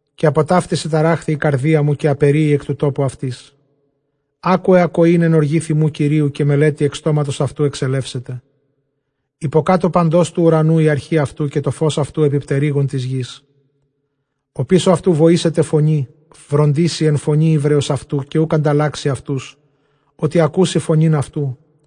Καὶ ἀπὸ ταύτης ἐταράχθη ἡ καρδία μου, καὶ ἀπεῤῥύη ἐκ τοῦ τόπου αὐτῆς. Ἄκουε ἀκοὴν ἐν ὀργῇ θυμοῦ Κυρίου, καὶ μελέτη ἐκ στόματος αὐτοῦ ἐξελεύσεται. Ὑποκάτω παντὸς τοῦ οὐρανοῦ ἡ ἀρχὴ αὐτοῦ, καὶ τὸ φῶς αὐτοῦ ἐπὶ πτερύγων τῆς γῆς. Ὀπίσω αὐτοῦ βοήσεται φωνῇ, βροντήσει ἐν φωνῇ ὕβρεως αὐτοὺ· καὶ οὐκ ἀνταλλάξει αὐτούς, ὅτι ἀκούσει φωνὴν αὐτοῦ.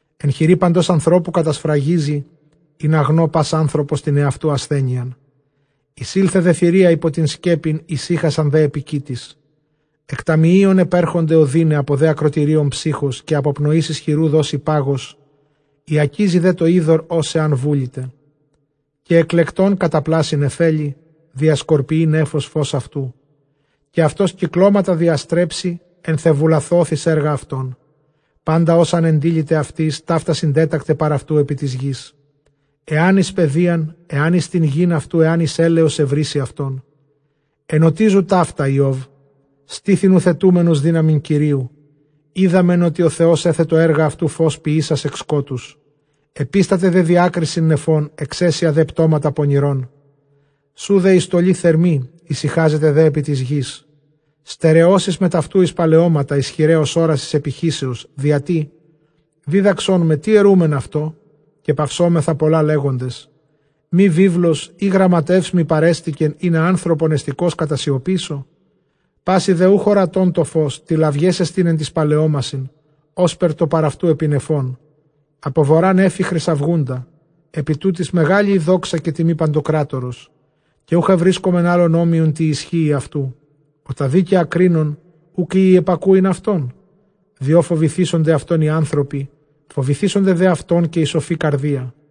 Ἐν χειρὶ παντὸς ἀνθρώπου κατασφραγίζει, ἵνα γνῷ πᾶς ἄνθρωπος τὴν ἑαυτοῦ ἀσθένειαν. Εἰσῆλθε δὲ θηρία ὑπὸ τὴν σκέπην, ἡσύχασαν δὲ ἐπὶ κοίτης. Ἐκ ταμιείων ἐπέρχονται ὀδύναι, ἀπὸ δὲ ἀκρωτηρίων ψῦχος· Καὶ ἀπὸ πνοῆς ἰσχυροῦ δώσει πάγος· οἰακίζει δὲ τὸ ὕδωρ ὡς ἐὰν βούληται, καὶ ἐκλεκτὸν καταπλάσσει νεφέλη· διασκορπιεῖ νέφος φῶς αὐτοῦ, καὶ αὐτὸς κυκλώματα διαστρέψει, ἐν θεεβουλαθὼθ, εἰς ἔργα αὐτῶν· πάντα ὅσα ἂν ἐντείληται αὐτοῖς, ταῦτα συντέτακται παρʼ αὐτοῦ ἐπὶ τῆς γῆς, ἐάν τε εἰς παιδείαν, ἐὰν εἰς τὴν γῆν αὐτοῦ, ἐὰν εἰς ἔλεος εὑρήσει αὐτόν. Ἐνωτίζου ταῦτα, Ἰώβ· στῆθι νουθετούμενος δύναμιν Κυρίου. Οἴδαμεν ὅτι ὁ Θεὸς ἔθετο ἔργα αὐτοῦ, φῶς ποιήσας ἐκ σκότους. Ἐπίσταται δὲ διάκρισιν νεφῶν, ἐξαίσια δὲ πτώματα πονηρῶν. Σοῦ δὲ ἡ στολὴ θερμὴ, ἡσυχάζεται δὲ ἐπὶ τῆς γῆς. Στερεώσεις μετʼ αὐτοῦ εἰς παλαιώματα, ἰσχυραὶ ὡς ὅρασις ἐπιχύσεως. Διατὶ δίδαξόν με, τί ἐροῦμεν αὐτῷ; καὶ παυσώμεθα πολλὰ λέγοντες. Μὴ βίβλος ἢ γραμματεύς μοι παρέστηκεν, ἵνα ἄνθρωπον ἑστηκὼς κατασιωπήσω; Πᾶσι δὲ οὐχ ὁρατὸν τὸ φῶς, τηλαυγές ἐστιν ἐν τοῖς παλαιώμασιν, ὥσπερ τὸ παρʼ αὐτοῦ ἐπὶ νεφῶν. Ἀπὸ Βοῤῥᾶ νέφη χρυσαυγοῦντα, ἐπὶ τούτοις μεγάλη ἡ δόξα καὶ τιμὴ παντοκράτορος, καὶ οὐχ εὑρίσκομεν ἄλλον ὅμοιον τῇ ἰσχύϊ αὐτοῦ· ὁ τὰ δίκαια κρίνων, οὐκ οἴει ἐπακούειν αὐτόν; Διὸ φοβηθήσονται αὐτὸν οἱ ἄνθρωποι, φοβηθήσονται δὲ αὐτὸν καὶ οἱ σοφοὶ καρδίᾳ.